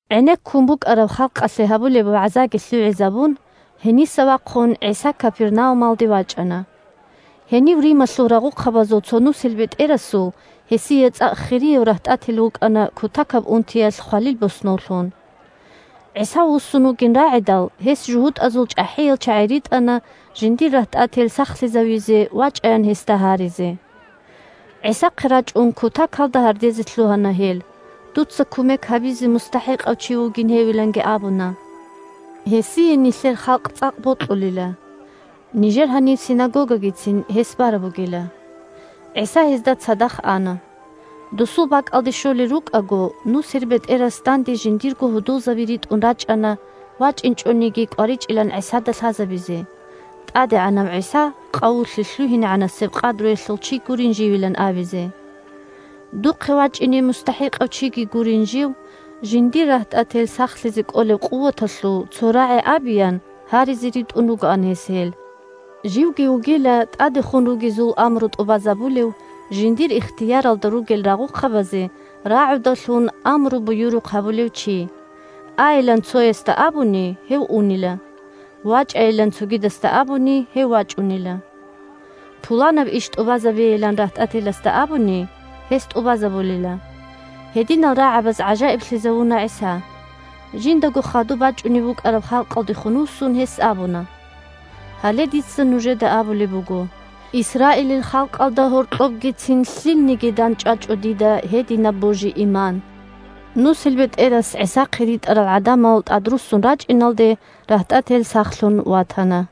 ГӀенеккун букӀараб халкъалъе гьабулеб вагӀзаги лъугӀизабун, гьениса вахъун ГӀиса Капернаумалде вачӀана. Гьенив Рималъул рагъухъабазул цо нусилбетӀерасул гьесие цӀакъ хирияв рагьтӀател вукӀана кутакаб унтиялъ хвалил боснов лъун. ГӀиса вуссун вугин рагӀидал, гьес жугьутӀазул чӀахӀиял чагӀи ритӀана жиндир рагьтӀател сахлъизавизе вачӀаян гьесда гьаризе. ГӀисахъе рачӀун кутакалда гьардезе лъугьана гьел, дуца кумек гьабизе мустахӀикъав чи вугин гьевиланги абуна. Гьесие нилъер халкъ цӀакъ бокьулила, нижер гьаниб синагогагицин гьес бараб бугила. ГӀиса гьезда цадахъ ана. Досул бакӀалде щолел рукӀаго, нусилбетӀерас данде жиндирго гьудулзаби ритӀун рачӀана вачӀинчӀониги кӀваричӀилан ГӀисада лъазабизе, ТӀадегӀанав ГӀиса къавулъе лъугьинегӀанасеб къадруялъул чи гурин живилан абизе. Духъе вачӀине мустахӀикъав чиги гурин жив, жиндир рагьтӀател сахлъизе кӀолеб къуваталъул цо рагӀи абеян гьаризе ритӀун ругоан гьес гьел. Живги вугила тӀадехун ругезул амру тӀубазабулев, жиндир ихтияралда ругел рагъухъабазе рагӀудалъун амру-буюрухъ гьабулев чи. Айилан цоясда абуни, гьев унила. ВачӀайилан цогидасда абуни, гьев вачӀунила. Пуланаб иш тӀубазабейилан рагьтӀателасда абуни, гьес тӀубазабулила. Гьединал рагӀабаз гӀажаиблъизавуна ГӀиса. Жиндаго хадуб бачӀунеб букӀараб халкъалдехун вуссун, гьес абуна: – Гьале дица нужеда абулеб буго: Исраилил халкъалда гьоркьобгицин лъилниги дандчӀвачӀо дида гьединаб божи-иман. НусилбетӀерас ГӀисахъе ритӀарал гӀадамал тӀадруссун рачӀиналде, рагьтӀател сахлъун ватана.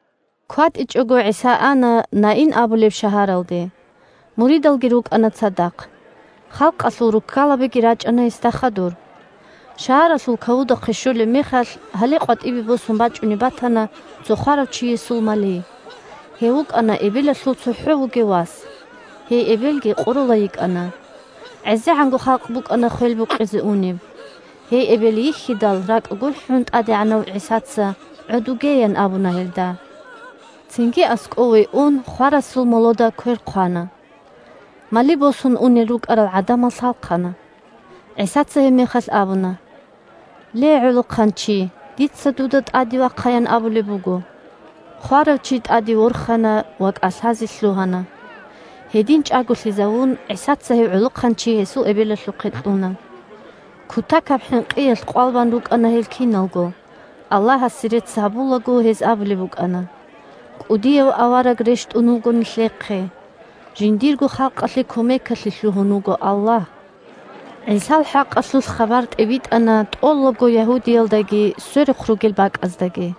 КватӀичӀого ГӀиса ана Наин абулеб шагьаралде. Муридалги рукӀана цадахъ. Халкъалъул руккалабиги рачӀана гьесда хадур. Шагьаралъул кавудахъе щолеб мехалъ, гьале къватӀибе босун бачӀунеб батана цо хварав чиясул мали. Гьев вукӀана эбелалъул цохӀо вугев вас, гьей эбелги къоролай йикӀана. ГӀезегӀанго халкъ букӀана хвел букъизе унеб. Гьей эбел йихьидал, ракӀ гурхӀун, ТӀадегӀанав ГӀисаца: – ГӀодуге! – ян абуна гьелда. Цинги аскӀове ун, хварасул молода квер хъвана. Мали босун унел рукӀарал гӀадамал лъалхъана. ГӀисаца гьебмехалъ абуна: – Ле, гӀолохъанчи! Дица дуда тӀаде вахъаян абулеб буго. Хварав чи тӀаде ворхана ва кӀалъазе лъугьана. Гьедин чӀаголъизавун, ГӀисаца гьев гӀолохъанчи гьесул эбелалъухъе кьуна. Кутакаб хӀинкъиялъ къвал бан рукӀана гьел киналго, Аллагьасе рецц гьабулаго, гьез абулеб букӀана: – КӀудияв авараг рещтӀун вуго нилъехъе, жиндирго халкъалъе кумекалъе лъугьун вуго Аллагь. ГӀисал хӀакъалъулъ хабар тӀибитӀана тӀолабго Ягьудиялдаги сверухъ ругел бакӀаздаги.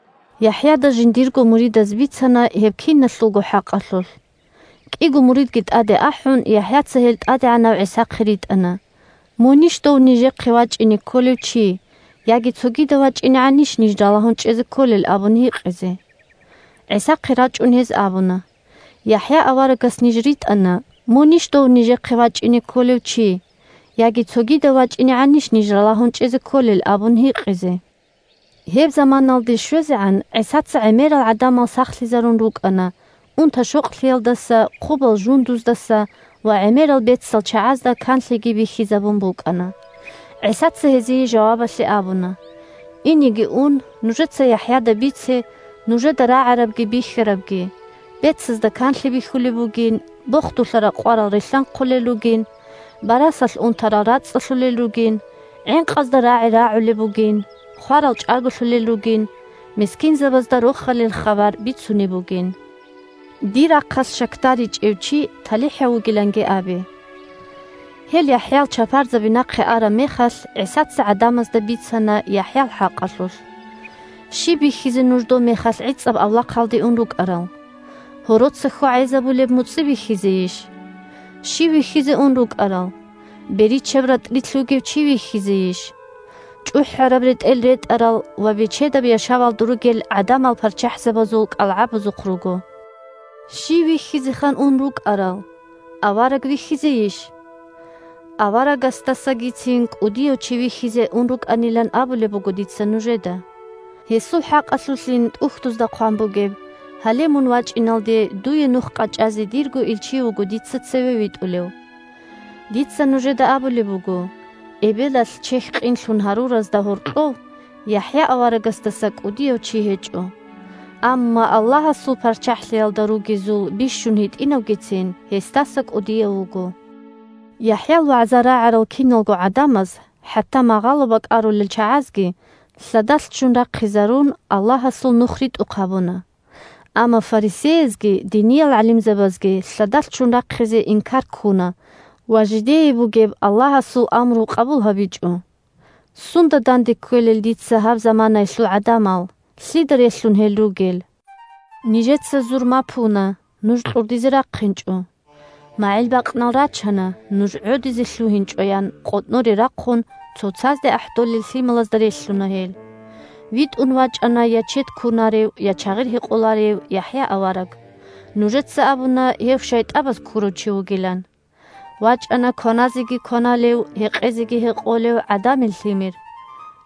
ЯхӀяда жиндирго муридаз бицана гьеб киналъулго хӀакъалъулъ. КӀиго муридги тӀаде ахӀун, ЯхӀяца гьел ТӀадегӀанав ГӀисахъе ритӀана: «Мунищ дов нижехъе вачӀине кколев чи, яги цогидав вачӀинегӀанищ ниж ралагьун чӀезе кколел?» – абун гьикъизе. ГӀисахъе рачӀун, гьез абуна: – ЯхӀя аварагас ниж ритӀана: «Мунищ дов нижехъе вачӀине кколев чи, яги цогидав вачӀинегӀанищ ниж ралагьун чӀезе кколел?» – абун гьикъизе. (Гьеб заманаялде щвезегӀан ГӀисаца гӀемерал гӀадамал сахлъизарун рукӀана унта-щокълъиялдаса, хъубал жундуздаса ва гӀемерал бецал чагӀазда канлъиги бихьизабун букӀана.) ГӀисаца гьезие жавабалъе абуна: – Инеги ун, нужеца ЯхӀяда бице нужеда рагӀарабги бихьарабги: бецазда канлъи бихьулеб бугин, бохдулъа ракъварал рилълъанхъулел ругин, барасалъ унтарал рацӀцӀалъулел ругин, гӀинкъазда рагӀи рагӀулеб бугин, хварал чӀаголъулел ругин, мискинзабазда Рохалил хабар бицунеб бугин. Дир рахъалъ щакдаричӀев чи талихӀав вугиланги абе. Гьел ЯхӀял чапарзаби нахъе араб мехалъ, ГӀисаца гӀадамазда бицана ЯхӀял хӀакъалъулъ: – Щиб бихьизе нуж добмехалъ гӀицӀаб авлахъалде ун рукӀарал? Гьороца хьвагӀезабулеб муцӀи бихьизейищ? Щив вихьизе ун рукӀарал? Беричаб ратӀлилъ вугев чи вихьизейищ? ЧӀухӀараб ретӀел ретӀарал ва бечедаб яшавалда ругел гӀадамал парччахӀзабазул кӀалгӀабазухъ руго. Щив вихьизеха ун рукӀарал? Авараг вихьизейищ? Аварагасдасагицин кӀудияв чи вихьизе ун рукӀанилан абулеб буго дица нужеда! Гьесул хӀакъалъулъин ТӀухьдузда хъван бугеб: «Гьале, мун вачӀиналде дуе нух къачӀазе дирго илчи вуго дица цеве витӀулев». Дица нужеда абулеб буго: эбелалъ чехь къинлъун гьаруразда гьоркьов ЯхӀя аварагасдаса кӀудияв чи гьечӀо. Амма Аллагьасул ПарччахӀлъиялда ругезул бищун гьитӀинавгицин гьесдаса кӀудияв вуго. ( ЯхӀял вагӀза рагӀарал киналго гӀадамаз, хӀатта магъало бакӀарулел чагӀазги, лъадалъ ччун рахъизарун, Аллагьасул Нух ритӀухъ гьабуна. Амма фарисеязги диниял гӀалимзабазги лъадалъ ччун рахъизе инкар ккуна ва жидее бугеб Аллагьасул амру къабул гьабичӀо.) Сунда данде кквелел дица гьаб заманаялъул гӀадамал, лъида релълъун гьел ругел? «Нижеца зурма пуна – Нуж кьурдизе рахъинчӀо! МагӀил бакънал рачана – Нуж гӀодизе лъугьинчӀо!» – ян къотӀноре рахъун цоцазде ахӀдолел лъималазда релълъуна гьел. ВитӀун вачӀана я чед кунарев, я чагъир гьекъоларев ЯхӀя авараг. Нужеца абуна гьев шайтӀабаз ккурав чи вугилан. ВачӀана кваназеги кваналев, гьекъезеги гьекъолев ГӀадамил Лъимер.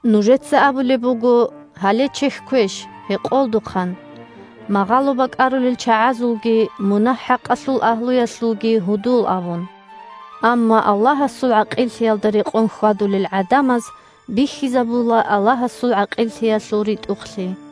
Нужеца абулеб буго: «Гьале чехьквеш, гьекъолдухъан, магъало бакӀарулел чагӀазулги мунагь-хӀакъалъул агьлуялъулги гьудул», – абун. Амма Аллагьасул ГӀакъиллъиялда рекъон хьвадулел гӀадамаз бихьизабула Аллагьасул ГӀакъиллъиялъул ритӀухълъи.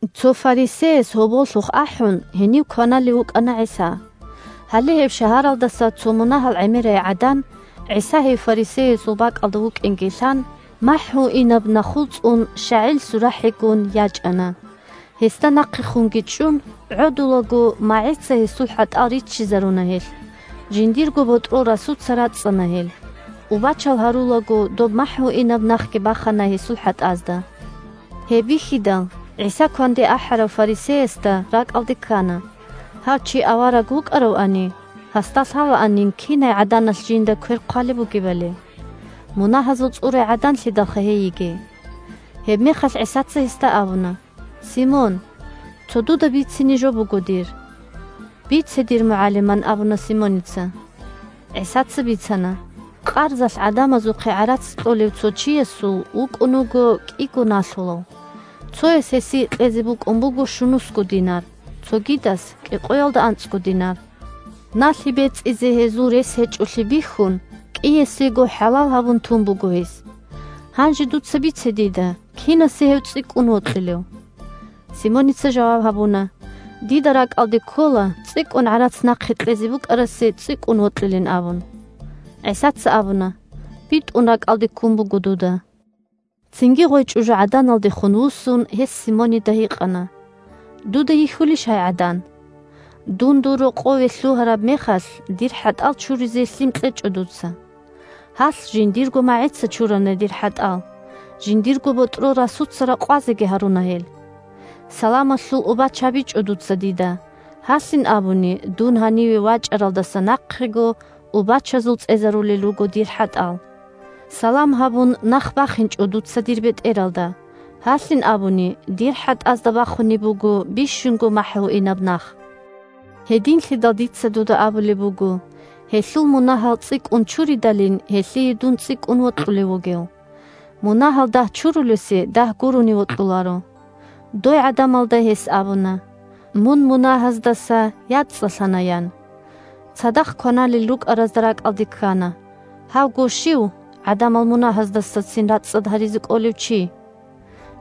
Цо фарисеяс гьоболлъухъ ахӀун, гьенив кваналев вукӀана ГӀиса. Гьале гьеб шагьаралдаса цо мунагьал гӀемерай гӀадан, ГӀиса гьев фарисеясул бакӀалда вукӀинги лъан, махӀгьуинаб нахул цӀун щагӀил сурахӀигун, ячӀана. Гьесда нахъехунги чӀун, гӀодулаго магӀица гьесул хӀатӀал риччизаруна гьелъ, жиндирго ботӀрол расуца рацӀцӀана гьел, убачал гьарулаго доб махӀгьуинаб нахги бахана гьесул хӀатӀазда. Гьеб бихьидал, ГӀиса кванде ахӀарав фарисеясда ракӀалде ккана, гьав чи авараг вукӀаравани, гьасда лъалаанин кинай гӀаданалъ жинда квер хъвалеб бугебали. Мунагьазул цӀурай гӀаданлъидалха гьей йигей. Гьебмехалъ ГӀисаца гьесда абуна: – Симон! Цо дуда бицине жо буго дир. – Бице, дир МугӀалим, – ан абуна Симоница. ГӀисаца бицана: – Къарзалъ гӀадамазухъе гӀарац кьолев цо чиясул вукӀун вуго кӀиго налъулав. Цояс гьесие кьезе букӀун буго щунусго динар, цогидас – кӀикъоялда анцӀго динар. Налъи бецӀизе гьезул рес гьечӀолъи бихьун, кӀиясего хӀалал гьабун тун буго гьес. Гьанже дуца бице дида: кинасе гьев цӀикӀкӀун вокьилев? Симоница жаваб гьабуна: – Дида ракӀалде ккола, цӀикӀкӀун гӀарац нахъе кьезе букӀарасе цӀикӀкӀун вокьилин абун. ГӀисаца абуна: – БитӀун ракӀалде ккун буго дуда. Цинги гъой чӀужугӀаданалдехун вуссун, гьес Симонида гьикъана: – Дуда йихьулищ гьай гӀадан? Дун дур рокъове лъугьараб мехалъ дир хӀатӀал чуризе лъим кьечӀо дуца. Гьалъ жиндирго магӀица чурана дир хӀатӀал, жиндирго ботӀрол расуца ракъвазеги гьаруна гьел. Саламалъул убач гьабичӀо дуца дида, гьалъин абуни дун гьаниве вачӀаралдаса нахъего убачазул цӀезарулел руго дир хӀатӀал. Салам гьабун нах бахинчӀо дуца дир бетӀералда, гьалъин абуни дир хӀатӀазда бахунеб буго бищунго махӀгьуинаб нах. Гьединлъидал дица дуда абулеб буго: гьелъул мунагьал цӀикӀкӀун чуридалин гьелъие дун цӀикӀкӀун вокьулев вугев. Мунагьал дагь чурулесе дагь гурони вокьуларо. Дой гӀадамалда гьес абуна: – Мун мунагьаздаса яцӀцӀалъана, – ян. Цадахъ кваналел рукӀаразда ракӀалде ккана: – Гьавго щив, гӀадамал мунагьаздасацин рацӀцӀад гьаризе кӀолев, чи?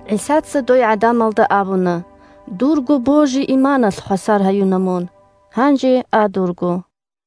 ГӀисаца дой гӀадамалда абуна: – Дурго божи-иманалъ хвасар гьаюна мун. Гьанже а дурго.